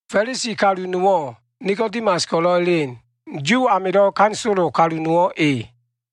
Fa꞉lisi kalu nowo꞉ Nikodimas ko꞉lo꞉ elen. Yu amilo꞉ ganisolo kalu nowo꞉ e.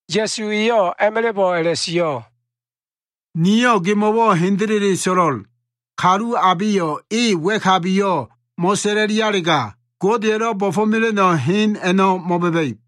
Ya꞉su eyo꞉ a꞉ma꞉la꞉bo꞉ a꞉la꞉sio꞉, “Niyo꞉ gemo꞉wo꞉ hendele so꞉lo꞉l. Kalu abeyo꞉ e wa꞉kabiyo꞉ mo꞉sa꞉la꞉lialega, Godeya꞉lo꞉ bo꞉fo꞉mela꞉no꞉ hen a꞉no꞉ mo꞉ba꞉ba꞉ib.”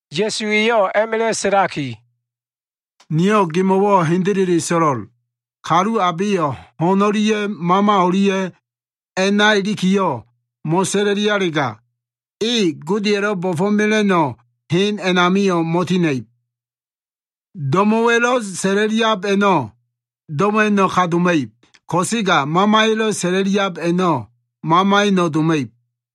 Ya꞉su eyo꞉ a꞉ma꞉la꞉ sa꞉laki, “Niyo꞉ gemo꞉wo꞉ hendele so꞉lo꞉l. Kalu abeyo꞉ ho꞉n o꞉lia꞉ Mama o꞉lia꞉ a꞉na ilikiyo꞉ mo꞉sa꞉la꞉lialega, e Godeya꞉lo꞉ bo꞉fo꞉mela꞉no꞉ hen a꞉namio꞉ mo꞉tina꞉ib. Do꞉mo꞉wa꞉lo꞉ sa꞉la꞉liab a꞉no꞉ do꞉mo꞉wa꞉no꞉ ka doma꞉ib. Ko꞉sega Mamaya꞉lo꞉ sa꞉la꞉liab a꞉no꞉, mamaya꞉no꞉ doma꞉ib.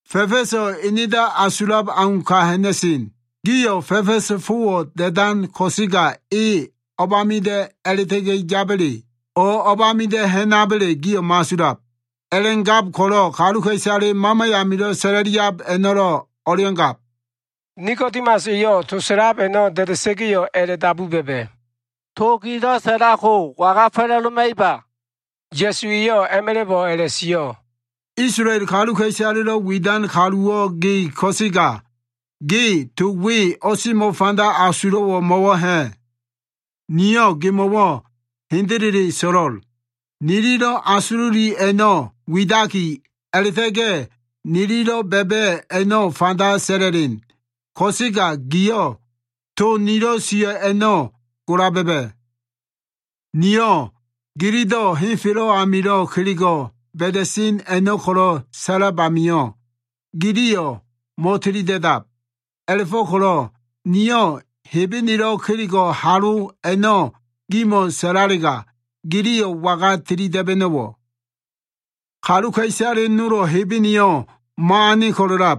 Fa꞉fa꞉so꞉ enedo꞉ asulab au ka ha꞉na꞉sen. Giyo꞉ fa꞉fa꞉sa꞉ fowo꞉ da꞉dan ko꞉sega, e o꞉bamida꞉ a꞉la꞉ta꞉ga꞉ yaba꞉le, o꞉ o꞉bamida꞉ ha꞉naba꞉le giyo꞉ mo꞉asulab. A꞉la꞉gab ko꞉lo꞉ kaluka꞉isale Mama amilo꞉ sa꞉la꞉liab a꞉no꞉lo꞉ o꞉lea꞉ngab.” Nikodimas eyo꞉ to sa꞉lab a꞉no꞉ da꞉da꞉sa꞉ga꞉yo꞉ a꞉la꞉dabu ba꞉ba꞉, “To gilo꞉ sa꞉lab ko waga fa꞉la꞉doma꞉iba?” Ya꞉su eyo꞉ a꞉ma꞉la꞉bo꞉ a꞉la꞉sio꞉, “Isolael kaluka꞉isalelo꞉ widan kaluwo꞉ ge ko꞉sega, ge to we o꞉semo꞉ fanda asulo꞉wo꞉ mo꞉wo꞉ ha꞉? Niyo꞉ gemo꞉wo꞉ hendele so꞉lo꞉l. Nililo꞉ asululi a꞉no꞉ widaki, a꞉la꞉ta꞉ga꞉ nililo꞉ ba꞉ba꞉ a꞉no꞉ fanda sa꞉la꞉len. Ko꞉sega gio꞉ to nilo꞉ sio꞉ a꞉no꞉ gola ba꞉ba꞉. Niyo꞉ gilido꞉ henfelo꞉ amilo꞉ kelego꞉ ba꞉da꞉sen a꞉no꞉ ko꞉lo꞉ sa꞉lab amio꞉, giliyo꞉ mo꞉tilida꞉dab. A꞉la꞉fo꞉ko꞉lo꞉ niyo꞉ Hebenelo꞉ kelego꞉ halo ko꞉lo꞉ gimo꞉ sa꞉lalega, giliyo꞉ waga tili da꞉ba꞉no꞉wo꞉? Kaluka꞉isale nolo꞉ Hebeneyo꞉ mo꞉ane ko꞉lo꞉lab.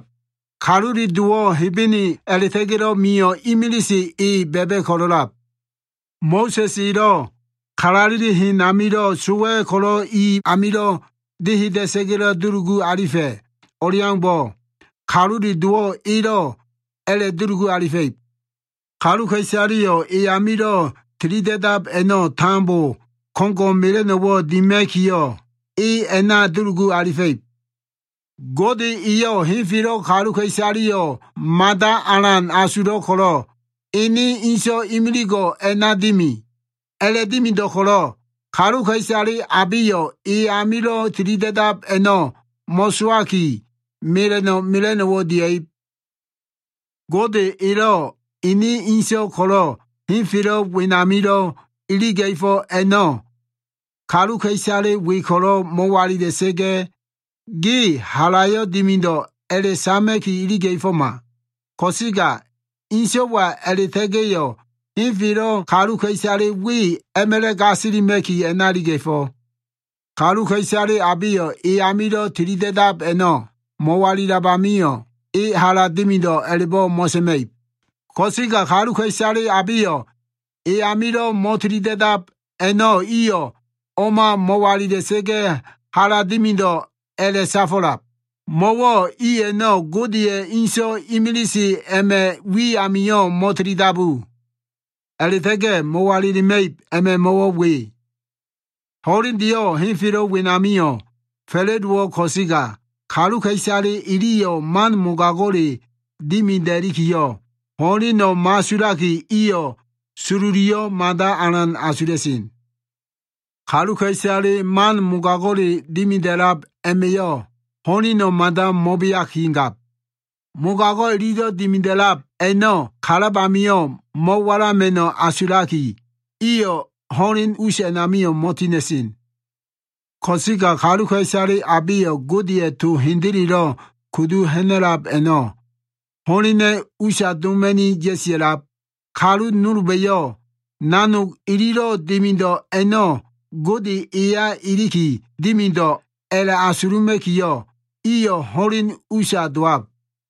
Kalule Dowo꞉ Hebene a꞉la꞉ta꞉ga꞉lo꞉ mio꞉ imilise e ba꞉ba꞉ ko꞉lo꞉lab. Mo꞉sa꞉s elo꞉ kalaleli hen amilo꞉ sowa꞉ ko꞉lo꞉ i amilo꞉ deheda꞉sa꞉ga꞉lo꞉ dulugu alifa꞉ o꞉leaumbo꞉, Kalule Dowo꞉ elo꞉ a꞉la꞉dulugu alifa꞉ib. Kaluka꞉isaleyo꞉ e amilo꞉ tilida꞉dab a꞉no꞉ tambo ko꞉ngo꞉ mela꞉no꞉wo꞉ dima꞉kiyo꞉, e a꞉na dulugu alifa꞉ib. “Gode eyo꞉ henfelo꞉ kaluka꞉isaleyo꞉ mada alan asulo꞉ ko꞉lo꞉, ene so꞉wa imiligo꞉ a꞉na dimi. A꞉la꞉dimido꞉ ko꞉lo꞉, kaluka꞉isale abeyo꞉ e amilo꞉ tilida꞉dab a꞉no꞉ mo꞉sowaki, mela꞉no꞉ mela꞉no꞉wo꞉ dia꞉ib. Gode elo꞉ ene so꞉wa ko꞉lo꞉ henfelo꞉ wenamilo꞉ iliga꞉fo꞉ a꞉no꞉, kaluka꞉isale we ko꞉lo꞉ mo꞉walila꞉sa꞉ga꞉, ge halayo꞉ dimido꞉ a꞉la꞉sama꞉ki iliga꞉foma. Ko꞉sega so꞉waya a꞉la꞉ta꞉ga꞉yo꞉ henfelo꞉ kaluka꞉isale we a꞉ma꞉la꞉ gasilima꞉ki, a꞉na iliga꞉fo꞉. Kaluka꞉isale abeyo꞉ e amilo꞉ tili da꞉dab a꞉no꞉ mo꞉walilab amio꞉, e hala dimido꞉ a꞉la꞉bo꞉ mo꞉sa꞉ma꞉ib. Ko꞉sega kaluka꞉isale abeyo꞉ e amilo꞉ mo꞉tili da꞉dab a꞉no꞉ iyo꞉ o꞉ma mo꞉walila꞉sa꞉ga꞉ hala dimido꞉ a꞉la꞉safo꞉lab, mo꞉wo꞉ i a꞉no꞉ Godeya꞉ ene so꞉wa imilise a꞉ma꞉ wi amio꞉ mo꞉tili dabu. A꞉la꞉ta꞉ga꞉ mo꞉walilima꞉ib a꞉ma꞉ mo꞉wo꞉ we. Ho꞉lendeyo꞉ henfelo꞉ wenamio꞉ fa꞉la꞉dowo꞉ ko꞉sega, kaluka꞉isale iliyo꞉ man mogago꞉le dimida꞉likiyo꞉ ho꞉leno꞉ mo꞉asulaki, iyo꞉ sololiyo꞉ mada alan asula꞉sen. Kaluka꞉isale man mogago꞉le dimida꞉lab a꞉ma꞉yo꞉ ho꞉leno꞉ mada mo꞉beakigab. Mogago꞉ ililo꞉ dimida꞉lab a꞉no꞉ kalab amio꞉ mo꞉walama꞉no꞉ asulaki, iyo꞉ ho꞉len us a꞉namio꞉ mo꞉tina꞉sen. Ko꞉sega kaluka꞉isale abeyo꞉ Godeya꞉ to hendelelo꞉ kudu ha꞉na꞉lab a꞉no꞉, ho꞉lena꞉ usa doma꞉ni ya꞉sia꞉lab. Kalu nolba꞉yo꞉ nanog ililo꞉ dimido꞉ a꞉no꞉ Gode eya iliki dimido꞉ a꞉la꞉asuluma꞉kiyo꞉, iyo꞉ ho꞉len usa dowab.”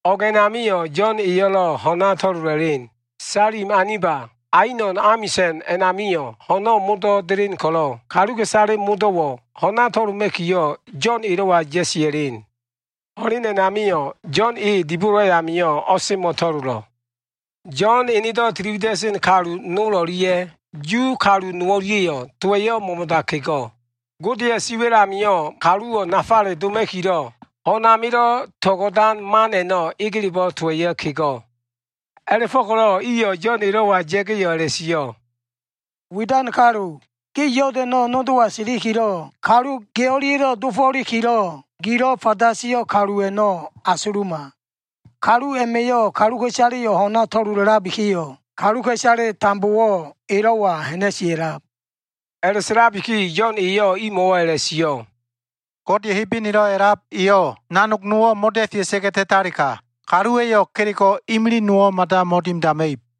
O꞉g a꞉namio꞉ Yo꞉n eyo꞉lo꞉ ho꞉na to꞉lola꞉len. Salim aniba Ainon amisa꞉n a꞉namio꞉ ho꞉no꞉ modo꞉ delen ko꞉lo꞉ kaluka꞉isale modo꞉wo꞉ ho꞉na to꞉loma꞉kiyo꞉, Yo꞉n elo꞉wa ya꞉sia꞉len. Ho꞉len a꞉namio꞉ Yo꞉n e dibolo ayamio꞉ o꞉semo꞉ to꞉lolo꞉. Yo꞉n enedo꞉ tili wida꞉sen kalu nol o꞉lia꞉ Yu kalu nowo꞉lia꞉yo꞉ towa꞉ mo꞉mo꞉da kego꞉. Godeya꞉ siwa꞉l amio꞉ kaluwo꞉ nafale doma꞉kilo꞉ ho꞉n amilo꞉ to꞉go꞉dan man a꞉no꞉ egelebo꞉ towa꞉yo꞉ kego꞉. A꞉la꞉fo꞉ko꞉lo꞉ iyo꞉ Yo꞉n elo꞉wa ya꞉ga꞉yo꞉ a꞉la꞉sio꞉, “Widan kalu, ge Yodano꞉ nodowa silikilo꞉ kalu ge o꞉lia꞉lo꞉ dofo꞉likilo꞉ gilo꞉ fanda sio꞉ kalu a꞉no꞉ asuluma. Kalu a꞉ma꞉yo꞉ kaluka꞉isaleyo꞉ ho꞉na to꞉lola꞉labikiyo꞉, kaluka꞉isale tambowo꞉ elo꞉wa ha꞉na꞉sia꞉lab.” A꞉la꞉sa꞉labiki Yo꞉n eyo꞉ imo꞉wo꞉ a꞉la꞉sio꞉, “Gode Hebenelo꞉ a꞉lab eyo꞉ nanog nowo꞉ mo꞉da꞉fea꞉sa꞉ga꞉ ta꞉talega, kaluwa꞉yo꞉ kelego꞉ imilig nowo꞉ mada mo꞉dimidama꞉ib.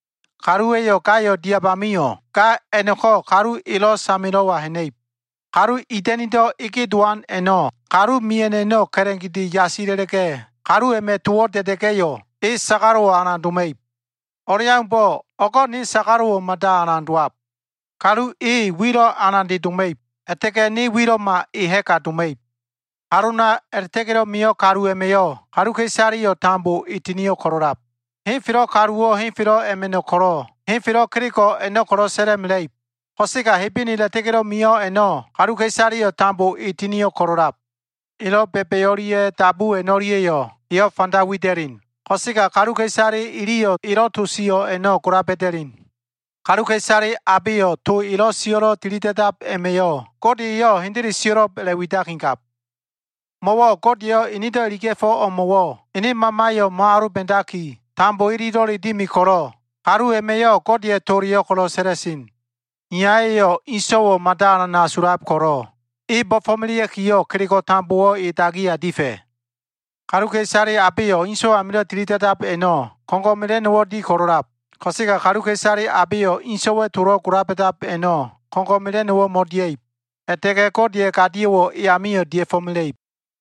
Kaluwa꞉yo꞉ gayo꞉ diab amio꞉, ga ko꞉ kalu elo꞉ samelo꞉wa ha꞉na꞉ib. Kalu ida꞉nido꞉ ege dowan a꞉no꞉ kalu mia꞉no꞉ a꞉no꞉ ka꞉la꞉gede yasila꞉la꞉ga꞉, kalu a꞉ma꞉ towo꞉ da꞉da꞉ga꞉yo꞉, e sagalo꞉wo꞉ alan doma꞉ib. O꞉leaumbo꞉, o꞉go꞉ ne sagalo꞉wo꞉ mada alan dowab. Kalu e, wilo꞉ alande doma꞉ib. A꞉la꞉ta꞉ga꞉ ne wilo꞉ma e ha꞉ga doma꞉ib. “Halona a꞉la꞉ta꞉ga꞉lo꞉ mio꞉ kalu a꞉ma꞉yo꞉ kaluka꞉isaleyo꞉ tambo e tinio꞉ ko꞉lo꞉lab. Henfelo꞉ kaluwo꞉ henfelo꞉ a꞉ma꞉no꞉ ko꞉lo꞉, henfelo꞉ kelego꞉ a꞉no꞉ ko꞉lo꞉ sa꞉la꞉mela꞉ib. Ko꞉sega Hebene a꞉la꞉ta꞉ga꞉lo꞉ mio꞉ a꞉no꞉, kaluka꞉isaleyo꞉ tambo e tinio꞉ ko꞉lo꞉lab. Elo꞉ ba꞉ba꞉ o꞉lia꞉ dabu a꞉no꞉lia꞉yo꞉ eyo꞉ fanda wida꞉len. Ko꞉sega kaluka꞉isale iliyo꞉ elo꞉ to sio꞉ a꞉no꞉ gola ba꞉da꞉len. Kaluka꞉isale abeyo꞉ to elo꞉ sio꞉lo꞉ tilida꞉dab a꞉ma꞉yo꞉ Gode eyo꞉ hendele sio꞉lo꞉b a꞉la꞉ widakigab. Mo꞉wo꞉ Gode eyo꞉ enedo꞉ iliga꞉fo꞉ o꞉mo꞉wo꞉ ene Mamayo꞉ mo꞉aloba꞉daki, tambo ililo꞉le dimi ko꞉lo꞉ kalu a꞉ma꞉yo꞉ Godeya꞉ toleyo꞉ ko꞉lo꞉ sa꞉la꞉sen. Iyaya꞉yo꞉ ene So꞉wayo꞉ mada alan asulab ko꞉lo꞉, e bo꞉fo꞉melea꞉kiyo꞉ kelego꞉ tambowo꞉ e dagiya difa꞉. Kaluka꞉isale abeyo꞉ So꞉wa amilo꞉ tili da꞉dab a꞉no꞉, ko꞉ngo꞉ mela꞉no꞉wo꞉ di ko꞉lo꞉lab. Ko꞉sega kaluka꞉isale abeyo꞉ inso꞉wa꞉ tolo꞉ gola ba꞉dab a꞉no꞉, ko꞉ngo꞉ mela꞉no꞉wo꞉ mo꞉dia꞉ib. A꞉la꞉ta꞉ga꞉ Godeya꞉ gadio꞉wo꞉ e amio꞉ dia꞉fo꞉mela꞉ib.”